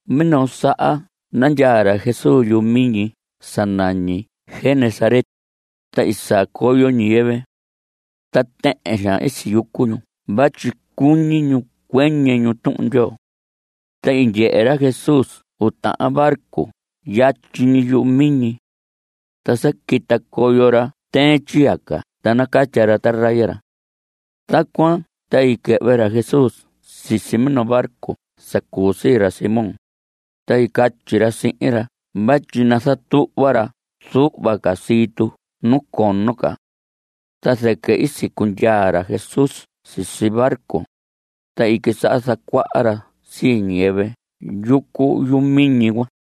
Minoo saha nandyaa ra Jesús yuhu miñi sa nañi Genesaret, ta i saa coyo ñiyɨvɨ. Ta tɨhɨn xaan i siyucu ñu vatyi cuñi ñu cuɨñɨ ñu Tuhun Ndyoo. Ta i ndyehe ra Jesús uu tahan barco yatyi ñi yumiñi. Ta sa quita coyo ra tɨɨn tyiyaca ta nacatya ra taraya ra. Tacuan ta i quɨhvɨ ra Jesús sisi minoo barco sa cuu sii ra Simón, ta i catyi ra sihin ra vatyi nazatuhva ra zuhva ca sii tu nu cono ca. Ta zɨquɨ i sicundyaa ra Jesús sisi barco, ta i quisaha zacuaha ra sii ñiyɨvɨ yucu yumiñi cuan.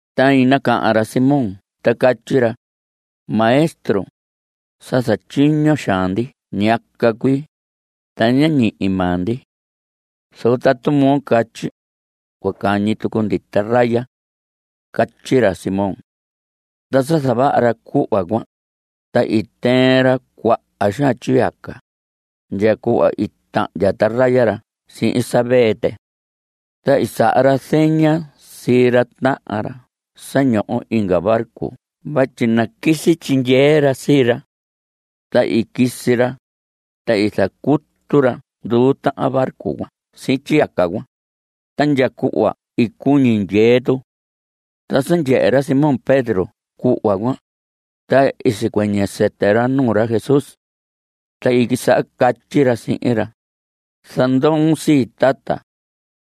Ta i nacahan ra Simón ta catyi ra: Maestro, sa zatyiño xaan ndi ñiyaca cuii, ta ñá ñihi maa ndi. Zoco tatu moo catyi, cua cañi tucu ndi taraya. Catyi ra Simón. Ta sa zavaha ra cuhva cuan, ta i tɨɨn ra cuaha xaan tyiyaca, ndya cuhva i tahndya taraya ra sihin sa vee tɨ. Ta i saha ra zeña sii ra tahan ra sa ñoho inga barco vatyi naquisi tyindyee ra sii ra. Ta i quisi ra, ta i zacutu ra nduu tahan barco cuan sihin tyiyaca cuan, ta ndya cuhva i cuñi ndyee tu. Ta sa ndyehe ra Simón Pedro cuhva cuan, ta i sicuɨñɨ sɨtɨ ra nuu ra Jesús. Ta i quisaha catyi ra sihin ra: Zandoon sii, tata,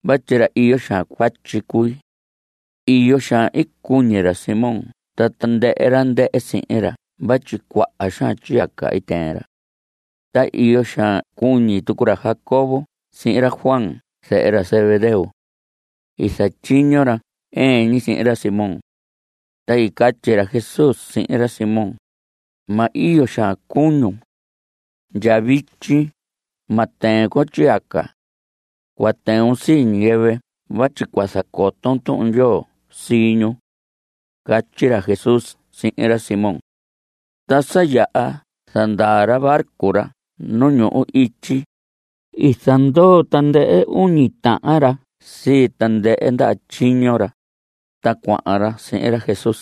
vatyi ra iyo xaan cuatyi cui. Iyo xaan i cuñi ra Simón ta tandɨhɨ ra ndɨhɨ sihin ra vatyi cuaha xaan tyiyaca i tɨɨn ra. Ta iyo xaan cuñi tucu ra Jacobo sihin ra Juan zehe ra Zebedeo. I zatyiño ra ɨɨn ñi sihin ra Simón. Ta i catyi ra Jesús sihin ra Simón: Ma iyo xaan cuñun. Ndya vityi ma tɨɨn con tyiyaca. Cua tɨun sii ñiyɨvɨ vatyi cua zacoton Tuhun Ndyoo sii ñu. Catyi ra Jesús sihin ra Simón. Ta sa yaha zandaa ra barco ra nu ñuhu ityi, i zandoo tandɨhɨ uñi tahan ra sii tandɨhɨ ndaha tyiño ra, ta cuahan ra sihin ra Jesús.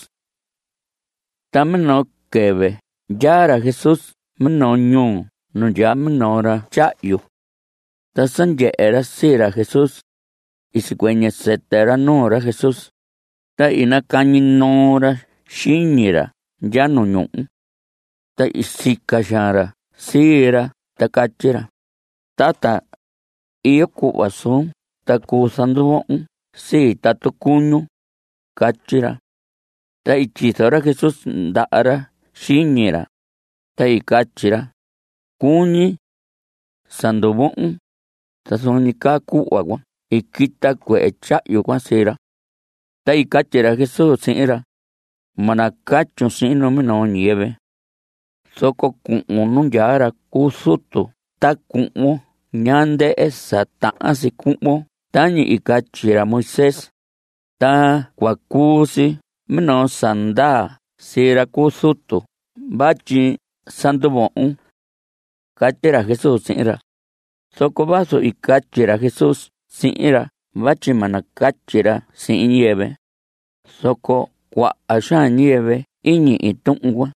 Ta minoo quɨvɨ ndyaa ra Jesús minoo ñuu nu ndyaa minoo ra tyahyu. Ta sa ndyehe ra sii ra Jesús, sicuɨñɨ sɨtɨ ra nuu ra Jesús, ta i nacañi noo ra xiñi ra ndya nu ñuhu. Ta i sica xaan ra sii ra ta catyi ra: Tata, iyo cuhva suun; ta cuu zanduvohon sii tatu cuñun. Catyi ra. Ta i tyizo ra Jesús ndaha ra xiñi ra, ta i catyi ra: Cuñi. Sa nduvohon. Ta zuun ñi caa cuhva cuan i quita cuehe tyahyu cuan sii ra. Ta i catyi ra Jesús sihin ra: Ma nacatyun sihin numinoo ñiyɨvɨ. Zoco cuhun nu ndyaa ra cu zutu ta cuhvon ñaa ndɨhɨ sa tahan si cuhvon tañi i catyi ra Moisés, ta cua cuu si minoo sa ndaa sii ra cu zutu vatyi sa nduvohon. Catyi ra Jesús sihin ra. Zoco vazu i catyi ra Jesús sihin ra vatyi ma nacatyi ra sihin ñiyɨvɨ, zoco cuaha xaan ñiyɨvɨ i ñihi tuhun cuan.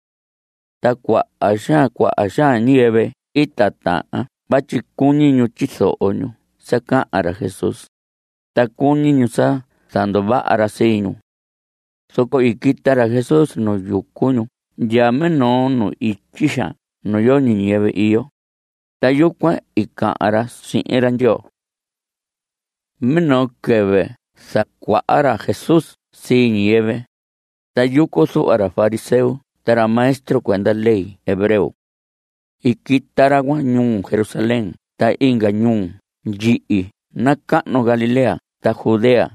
Ta cuaha xaan cuaha xaan ñiyɨvɨ i titahan vatyi cuñi ñu tyizoho ñu sa cahan ra Jesús, ta cuñi ñu sa zanduvaha ra sii ñu. Zoco i quita ra Jesús nu yucu ñu ndya minoo nu ityi xaan nu yoñi ñiyɨvɨ iyo, ta yucuan i cahan ra sihin ra Ndyoo. Minoo quɨvɨ zacuaha ra Jesús sii ñiyɨvɨ, ta yucu zuhva ra fariseo ta ra maestro cuenda ley hebreo. I quita ra cuan ñuu Jerusalén ta inga ñuu ndyihi nacahnu Galilea ta Judea.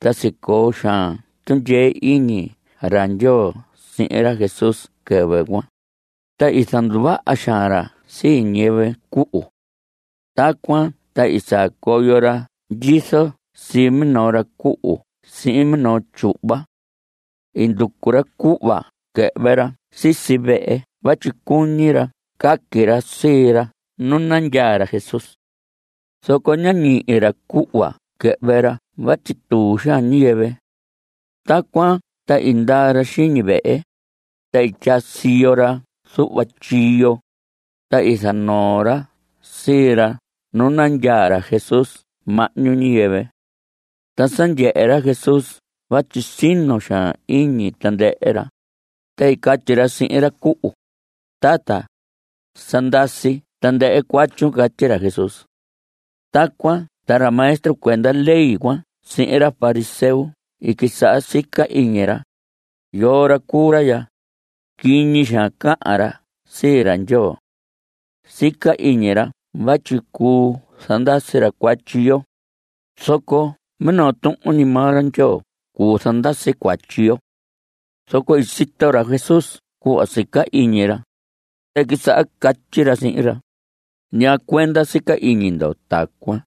Ta sicoo xaan tundyee iñi ra Ndyoo sihin ra Jesús quɨvɨ cuan, ta i zanduvaha xaan ra sii ñiyɨvɨ cuhu. Tacuan ta i saa coyo ra ndyizo sii minoo ra cuhu sihin minoo tyuhva. I nducu ra cuhva quɨhvɨ ra sisi vehe vatyi cuñi ra caqui ra sii ra nu nandyaa ra Jesús. Zoco ñá ñihi ra cuhva quɨhvɨ ra vatyi tuu xaan ñiyɨvɨ. Tacuan ta i ndaa ra xiñi vehe, ta i tyaa siyo ra zuhva tyiyo, ta i zanoo ra sii ra nu nandyaa ra Jesús mahñu ñiyɨvɨ. Ta sa ndyehe ra Jesús vatyi sino xaan iñi tandɨhɨ ra, ta i catyi ra sihin ra cuhu: Tata, sa ndasi tandɨhɨ cuatyun. Catyi ra Jesús. Tacuan ta ra maestro cuenda ley cuan sihin ra fariseo i quisaha sica iñi ra: “¿Yoo ra cuu ra ya? Quiñi xaan cahan ra sii ra Ndyoo. Sica iñi ra vatyi cuu zandasi ra cuatyi yo, zoco minoo tuhun ñi maa ra Ndyoo cuu zandasi cuatyi yo.” Zoco i sito ra Jesús cuhva sica iñi ra, ta i quisaha catyi ra sihin ra: ¿Ñaa cuenda sica iñi ndo tacuan?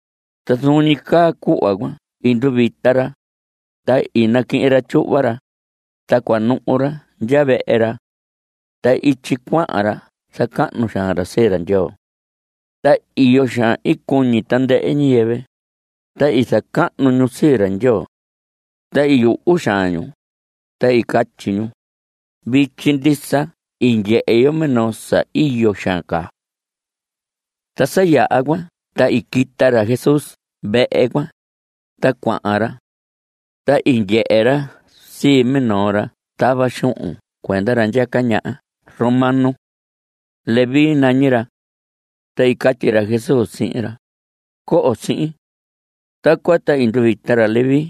Ta zuun ñi caa cuhva cuan i nduvita ra, ta i naquihin ra tyuhva ra, ta cua nuhu ra ndya vehe ra. Ta ityi cuahan ra zacahnu xaan ra sii ra Ndyoo. Ta iyo xaan i cuñi tandɨhɨ ñiyɨvɨ, ta i zacahnu ñu sii ra Ndyoo. Ta i yuhu xaan ñu, ta i catyi ñu: Vityi ndisa i ndyehe yo minoo sa iyo xaan caa. Ta sa yaha cuan, ta i quita ra Jesús vehe cuan, ta cuahan ra. Ta i ndyehe ra sii minoo ra tava xuhun cuenda ra ndyaca ñaha romano. Leví nañi ra. Ta i catyi ra Jesús sihin ra: Coho sihin. Tacuan ta i nduvita ra Leví.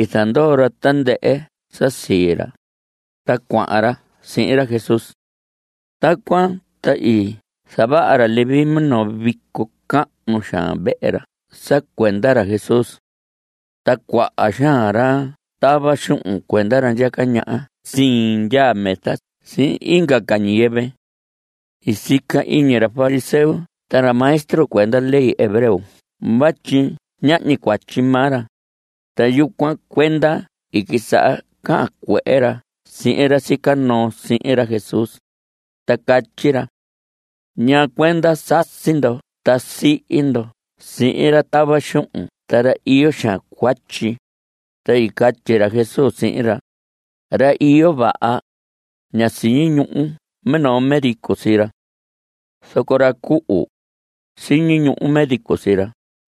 I zandoo ra tandɨhɨ sa sii ra, ta cuahan ra sihin ra Jesús. Tacuan ta i zavaha ra Leví minoo vico cahnu xaan vehe ra sa cuenda ra Jesús. Ta cuaha xaan ra tava xuhun cuenda ra ndyaca ñaha sindyaa mesa sihin inga ca ñiyɨvɨ. (I sica iñi ra fariseo ta ra maestro cuenda ley hebreo vatyi ñahñi cuatyi maa ra), ta yucuan cuenda i quisaha cahan cuehe ra sihin ra sica noo sihin ra Jesús, ta catyi ra: ¿Ñaa cuenda sasi ndo ta sihi ndo sihin ra tava xuhun ta ra iyo xaan cuatyi? Ta i catyi ra Jesús sihin ra: Ra iyo vaha, ña siñi ñuhu minoo médico sii ra. Zoco ra cuhu, siñi ñuhu médico sii ra.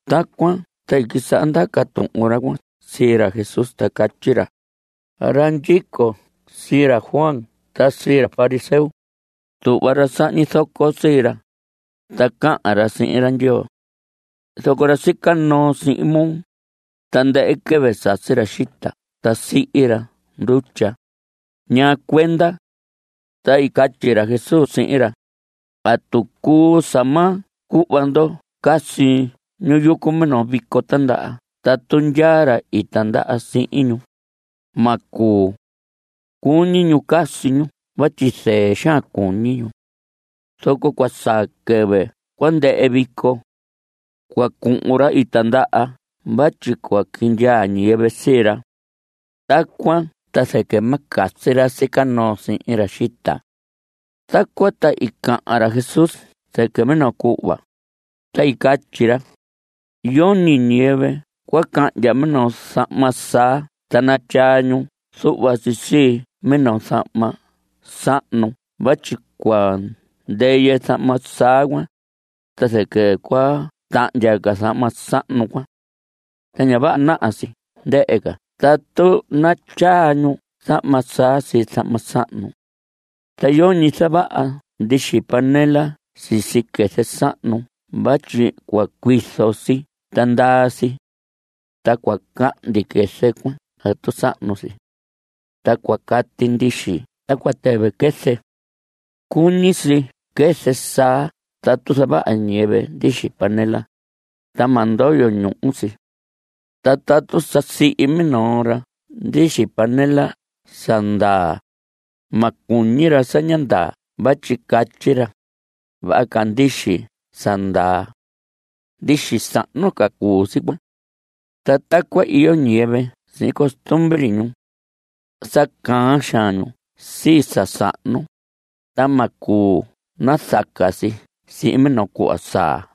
Tacuan ta i quisaha ndaca tuhun ra cuan sii ra Jesús ta catyi ra: Ra ndyico sii ra Juan ta sii ra fariseo, tuhva ra sahñi zoco sii ra, ta cahan ra sihin ra Ndyoo. Zoco ra sica noo sihin moo, tandɨhɨ quɨvɨ sasi ra xita ta sihi ra ndutya. ¿Ñaa cuenda? Ta i catyi ra Jesús sihin ra: ¿Atu cuu sa ma cuhva ndo casi ñu yucu minoo vico tindaha tatu ndyaa ra i tindaha sihin ñu? Ma cuu. Cuñi ñu casi ñu vatyi zɨɨ xaan cuñi ñu. Zoco cua saa quɨvɨ cua ndɨhɨ vico. Cua cuhun ra i tindaha vatyi cua quindyaa ñiyɨvɨ sii ra. Tacuan ta zɨquɨ ma casi ra sica noo sihin ra xita. Tacuan ta i cahan ra Jesús zɨquɨ minoo cuhva, ta i catyi ra: Yoñi ñiyɨvɨ cua cahndya minoo zahma saa ta natyaa ñu zuhva si sii minoo zahma sahnu vatyi cua ndɨyɨ zahma saa cuan, ta zɨquɨ cua tahndya ca zahma sahnu cuan. Ta ña vaha naha si ndɨhɨ ca tatu natyaa ñu zahma saa sii zahma sahnu. Ta yoñi zavaha ndixi panela sisi quɨzɨ sahnu vatyi cua cuizo si ta ndaa si. Ta cua cahndi quɨzɨ cuan tatu sahnu si. Ta cua cati ndixi ta cua tɨvɨ quɨzɨ. Cuñi si quɨzɨ saa tatu zavaha ñiyɨvɨ ndixi panela, ta ma ndoyo ñuhu si. Ta tatu sa sihi minoo ra ndixi panela sa ndaa, ma cuñi ra sa ñá ndaa vatyi catyi ra: “Vaha ca ndixi sa ndaa.” Ndixi sahnu ca cuu si cuan. (Ta tacuan iyo ñiyɨvɨ sihin costumbre ñu. Sa caan xaan ñu sii sa sahnu, ta ma cuu nazaca si sihin minoo cuhva saa.)